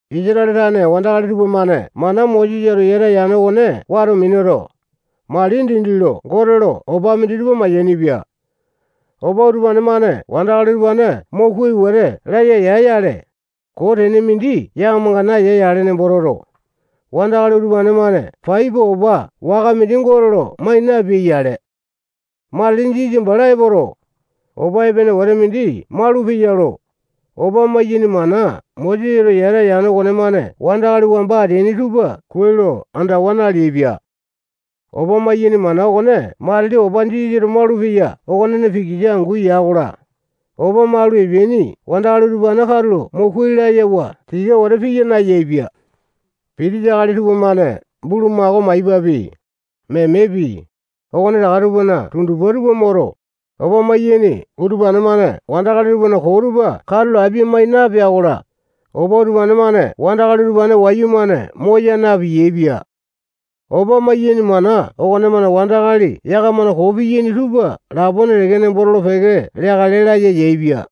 Isatale tane wandakali tupamane mana Mosesato yata yane okone wato minuto, mali dindi lo Gote lo opa minditupa mayainipia. Opa utupa-mane wandakali utupane mo kuai wete laya ya-yale, koo tene mindi yakamanga naeya nembo toto, wandakali utupane-mane pai pua opa waka mindi Gote lo mai napeai-yale. Matili Jisasa bala epoto, opa epene wete mindi maulupeya lo, opa maiyaini mana Mosesato yata yane okonemane wandakali wamba ateaini tupa kuai lo andawa naleaipia. Opa maiyaini mana okone matili opa Jisasato malupeya okonena pikisa angu ya-kola, opa malu epeaini wandakali utupane katulo mo kuai layawa tika wete piya nayaepia. Pitisa akali tupamane bulumako maipapi, memepi, okonetaka tupana tundupa tupa moto, opa maiyaini utupane-mane wandakali tupana koo tupa katulo apia-mai napea-kola, opa utupane-mane wandakali utupane wayumane moya na-piyaepia. Opa maiyaini mana okonemane wandakali yakamana koo piyaini tupa lapone teke nembo tolo-peke leakale laya yaepia.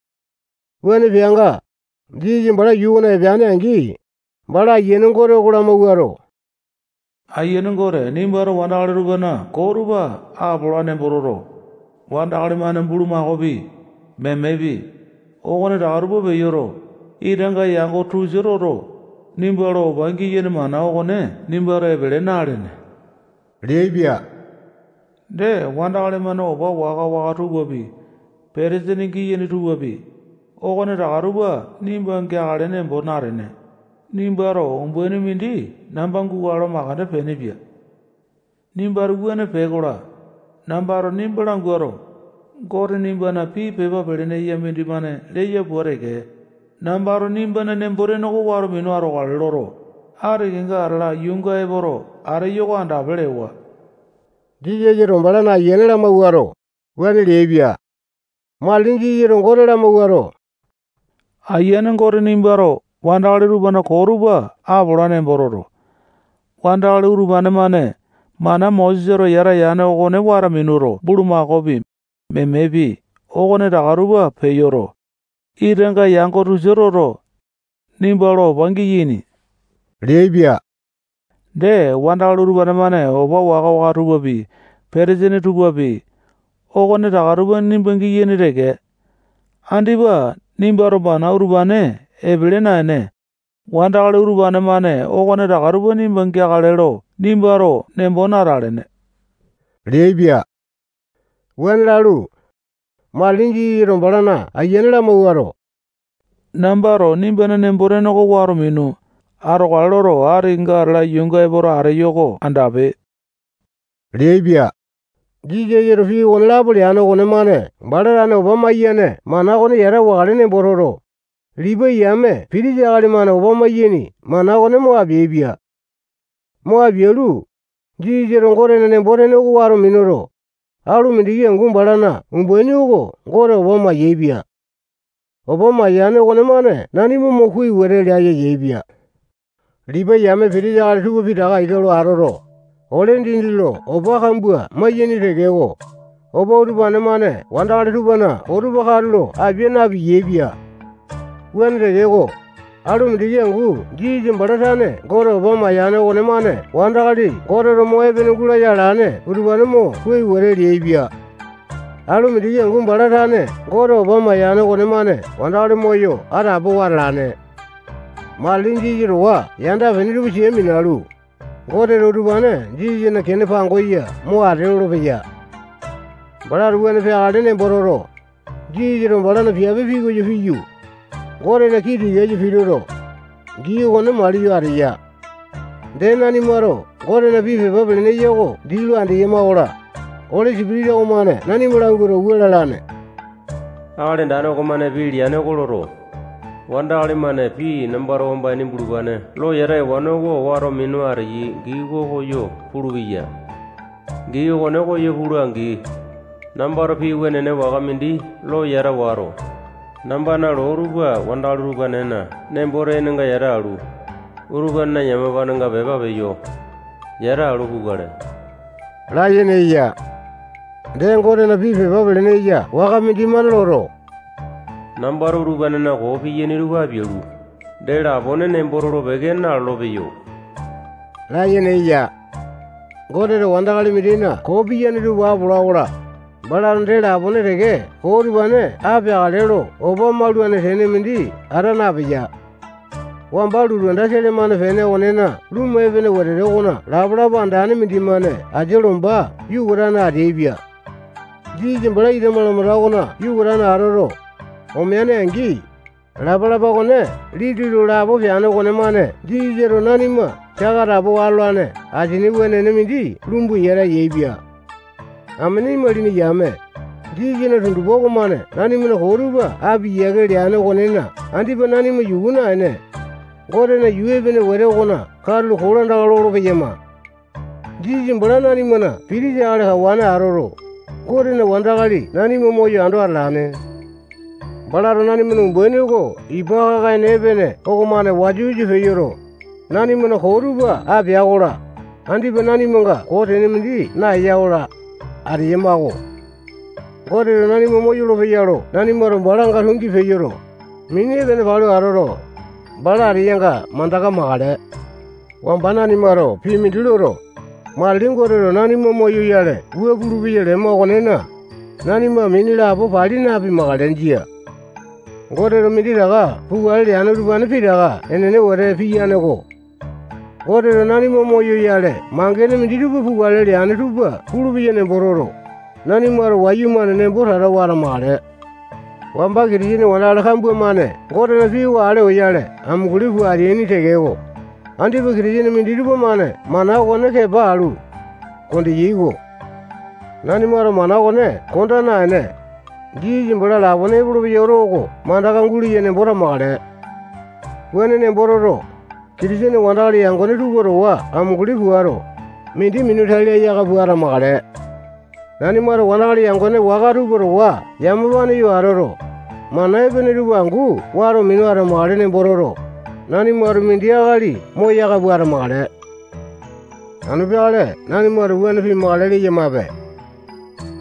Wuane peanga, Jisasa bala yuu okona epeane-angi, bala ayiane Gote oko lamawuato, Aiyane Gote, nimbato wandakali tupana koo tupa apola nemboto, wandakali-mane bulumakaopi, memepi, okonetaka tupa peyoto, itanga yango tosia toto, nimba lo opa giyaini mana okone nimbato epele na-alene leaipia. Dee, wandakali-mane opa waka-waka tupapi, petesini giyaini tupapi, okonetaka tupa nimba geakale nembo natene, nimbato umbaini mindi namba gukale lo makande peenepia. Nimbato wuane pee-kola, nambato nimba languato, Gote nimbana pii pepa pelene eya mindimane leya pua teke, nambato nimbana nembo-tene oko wato minu atokale loto, ati kenga atala yuunga epoto ateyo oko andape lewa. Jisasato balana ayiane lamawuato, wuane leaipia. Matili Jisasato Gote lamawuato, Aiyane Gote nimbato wandakali tupana koo tupa apola nembo toto, wandakali utupane-mane mana Mosesato yata yane okone wato minuto, bulumakaopi, memepi, okonetaka tupa peyoto, itanga yango tosia toto, nimba lo opa giyaini leaipia. Dee, wandakali utupane-mane opa waka-waka tupapi, petesini tupapi, okonetaka tupa nimba giyaini teke. Andipa nimbato mana utupane epele naene, wandakali utupane-mane okonetaka tupa nimba geakale lo nimbato nembo natalene leaipia. Wuane lalu, matili Jisasato balana ayiane lamawuato, nambato nimbana nembo-tene oko wato minu atokale loto, ati kenga atala yuunga epoto ateyo-ko andape leaipia. Jisasato pii okonelapo leane okonemane bala tane opa mayane mana okone yata wakale nembo toto, Lipai yame pitisa akali-mane opa maiyaini mana okone mo apeaipia. Mo apialu, Jisasato Gotena nembo-tene oko wato minuto, alu mindiki angu balana umbaini oko Gote opa mayaepia. Opa mayane okonemane nanima mo kuai wete laya yaepia. Lipai yame pitisa akali tupa pitaka ika lo atoto, ole dindi lo opa kambua maiyaini tekeko, opa utupane-mane wandakali tupana koo tupa katulo apia na-piyaepia. Wuane tekeko, alu mindiki angu Jisasa bala tane Gote opa mayane okonemane wandakali Goteto mo epene gulaya alane utupane mo kuai wete leaipia. Alu mindiki angu bala tane Gote opa mayane okonemane wandakali moyo atapowa atalane. Matili Jisasa towa yanda-pene tupa sia minalu, Goteto utupane Jisasana kene pangosa mo ate lolopeya. Balato wuane peakale nembo toto, Jisasato balana piape pikoyo piyu, Gotena kii tikasa pituto, gii okone maliyo ateya. Dee, nanimato Gotena pii pepa pelene eya oko dii lo andeyama-kola, Oli Sipitisa okomane nanima languato, wua lalamane: Akali Andane okomane pii mindi leane oko loto, wandakali-mane pii nambato wamba ini bulupane lo yata ewane oko wato minu ateyai gii okone koyo pulupeya. Gii okone koyo pula-angi, nambato pii wenene waka mindi lo yata wato, nambana loo tupa wandakali utupanena nembo-tenenga yata alu, utupanena yamapanenga pepa peyo yatalu, pukale layene eya. Dee, Gotena pii pepa pelene eya waka mindimane loto, nambato utupanena koo piyaini tupa apialu, dee lapone nembo tolo-peke nalolo-peyo layene eya. Goteto wandakali mindina koo piyane tupa apola-kola, balato dee lapone teke koo utupane apeakale lo opa maulane tene mindi ata napeya. Wamba lotu anda sele-mane pene okonena lumu epene wetete okona lapalapa andane mindimane asia lomba yukatane atalaepia. Jisasa bala ita malamanda okona yukatane atoto, omea-angi, lapalapa okone liti lo lapo peane okonemane Jisasato nanima saka atapowa atolane asini wenene mindi lumbu yata yaepia. Amene imalini yame, Jisasana tundupa okomane nanimana koo tupa apia yiake leane okonena andipa nanima yuku naene, Gotena yuu epene wete okona katulo kolandaka lolo-peyama. Jisasa bala nanimana pitisa akali kawane atoto, Gotena wandakali nanima moyo ando atalane. Balato nanimana umbaini oko ipa kaka-ene epene okomane wasa-wasa peyoto, nanimana koo tupa apea-kola, andipa nanimanga koo tene mindi naeya-kola, ateyama-ko. Goteto nanima moyolo-peya lo nanimato balanga tungi peyoto, mini epene palu atoto, bala ateyanga mandaka makale. Wamba nanimato pii mindi loto, matili Goteto nanima moyoyale wua pulupeya lema okonena, nanima mini lapo pali napimakale. Jia. Goteto minditaka pukale leane utupane pitaka enene wete piyane-ko. Goteto nanima moyoyale mangene minditupa pukale leane tupa pulupeya nembo toto, nanimato wayumane nembo tatawa atamakale. Wamba Kitisene wandakali kambua-mane Gotena pii oko ale oyale amunguli pua ateaini tekeko, andipa Kitisene minditupa-mane mana okone kepa alu, kondeyai-ko. Nanimato mana okone konda naene, Jisasa bala lapone epolopeya oto oko mandaka guleya nembo tamakale. Wuane nembo toto, Kitisene wandakali yangone tupa towa amunguli puato, mindi minu tai laya aka pua atamakale. Nanimato wandakali yangone waka tupa towa yamapane yo atoto, mana epene tupa angu wato minu atamakale nembo toto, nanimato mindi akali moyaka pua atamakale. Anu peakale nanimato wuane pimakale leyamape.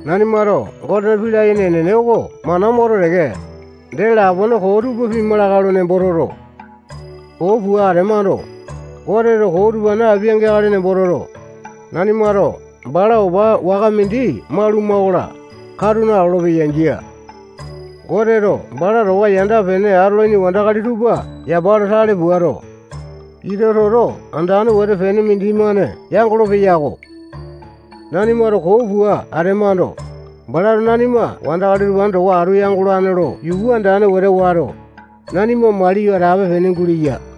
Nanimato Gotena pii layene enene oko mana moto teke, dee lapone koo tupa pima lakae lo nembo toto, koo pua atemando, Goteto koo utupane apeakale nembo toto, nanimato bala opa waka mindi mauluma-kola, katu nalolo-peya. Jia. Goteto bala towa yanda-pene atolaini wandakali tupa yapa lo tale puato, ita toto andane wete pene mindimane yangolo-peyako. Nanimato koo pua atemando, balato nanima wandakali utupane towa atu yangolane lo yuku andane wete wato, nanima maliyo atape-pene guleya.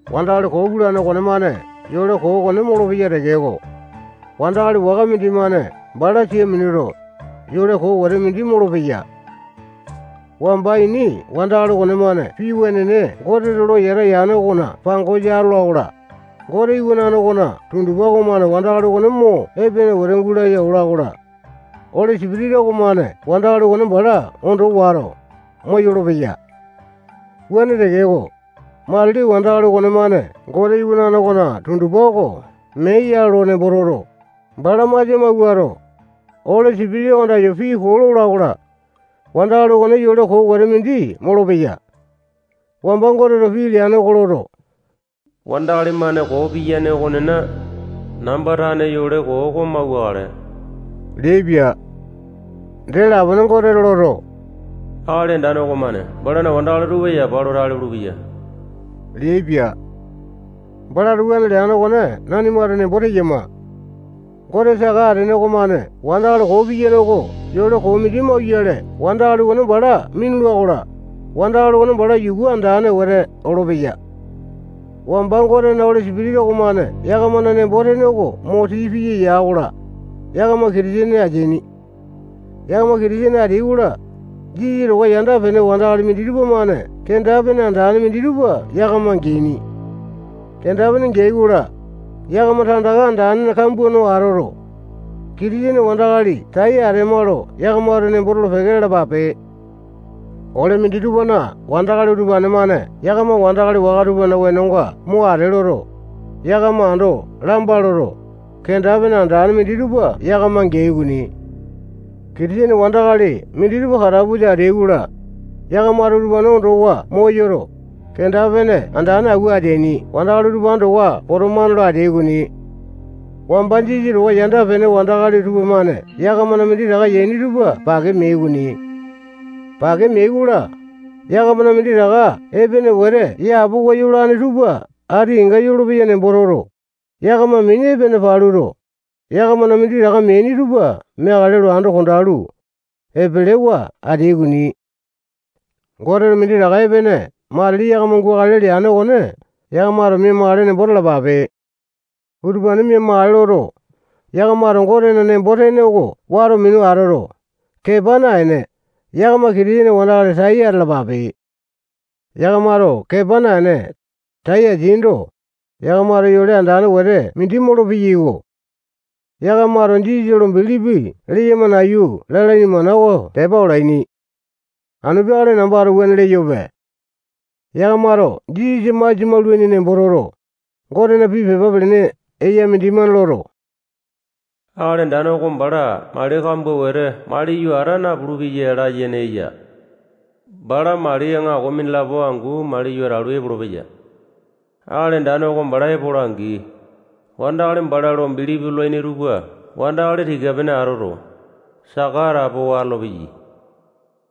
Wandakali koo pulane okonemane yole koo okone molopeya tekeko, wandakali waka mindimane bala sia minuto, yole koo wete mindi molopeya. Wamba ini wandakali okonemane pii wenene Goteto lo yata yane okona pangosa atola-kola, Gote Iwanane okona tundupa okomane wandakali okone mo epene wete gulaya ola-kola, Oli Sipitisa okomane wandakali okone bala ondo wato, moyolo-peya. Wuane tekeko, matili wandakali okonemane Gote iwanane okona tundupa oko mee ya lo nembo toto, bala masia mawuato, Oli Sipitisa oko andayo pii koo lola-kola, wandakali okone yole koo wete mindi molopeya. Wamba Goteto pii leane oko loto, wandakali-mane koo piyane okonena, namba tane yole koo oko mauwakale leaipia. Dee lapone Goteto loto, Akali Andane okomane balana wandakali tupa yapa lo tale pulupeya leaipia. Balato wuane leane okone nanimato nembo teyama. Gote saka atene okomane wandakali koo piyane oko yole koo mindi mauyale wandakali okone bala minula-kola, wandakali okone bala yuku andane wete olopeya. Wamba Gotena Oli Sipitisa okomane yakamana nembo-tene oko mo tii piya ya-kola, yakama Kitisene ateaini. Yakama Kitisene ateai-kola, Jisasa towa yanda-pene wandakali minditupa-mane kenda-pene andane minditupa yakama geaini. Kenda-pene geai-kola, yakama tandaka andane kambua no atoto, Kitisene wandakali tai atema lo yakamato nembo tolo-peke lalapape. Ole minditupana wandakali utupane-mane yakama wandakali waka tupana wenonga mo ate loto, yakama ando lamba loto, kenda-pene andane minditupa yakama geai okoni. Kitisene wandakali minditupa katapusa ateai-kola, yakamato utupane ondowa moyoto, kenda-pene andane awua ateaini wandakali utupane towa potomane lo ateai okoni. Wamba Jisasa towa yanda-pene wandakali tupamane yakamana minditaka yaini tupa pake meai okoni. Pake meai-kola, yakamana minditaka epene wete yapowa yolane tupa ati kenga yolopeya nembo toto, yakama mini epene paluto, yakamana minditaka meaini tupa meakale lo ando kondalu, epelewa ateai okoni. Goteto minditaka epene matili yakama gukale leane okone yakamato mia-makale nembo talapape. Utupane mia-makale toto, yakamato Gotena nembo-tene oko wato minu atoto, kepa naene, yakama Kitisene wandakali tai atalapape. Yakamato kepa naene, tai ateaindo, yakamato yole andane wete mindi molopeyai-ko. Yakamato Jisasa lo bilipi leyama nayu lalaini mana oko tepa olaini. Anu peakale nambato wuane leyope. Yakamato Jisasa masia maulaini nembo toto, Gotena pii pepa pelene eya mindimane loto, Akali Andane oko bala mali kambua wete maliyo ata napulu-peya layene eya. Bala mali aŋako mindilapo angu maliyo atalu, epolopeya. Akali Andane oko bala epola-angi, wandakali bala lo bilipi lolaini tupa wandakali tika-pene atoto, saka atapowa atolopeya.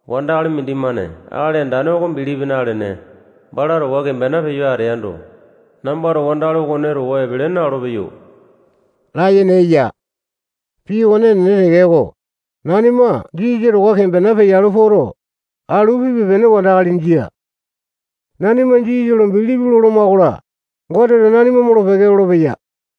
Wandakali mindimane Akali Andane oko bilipi nalene, bala towa kembena peyo ateando, nambato wandakali okone towa epele na-olopeyo layene eya. Pii okone enene tekeko, nanima Jisasa towa kembena peyalu poto, alu pipe-pene wandakali jia. Nanimato Jisasa lo bilipi loloma-kola, Goteto nanima molo-peke lolopeya.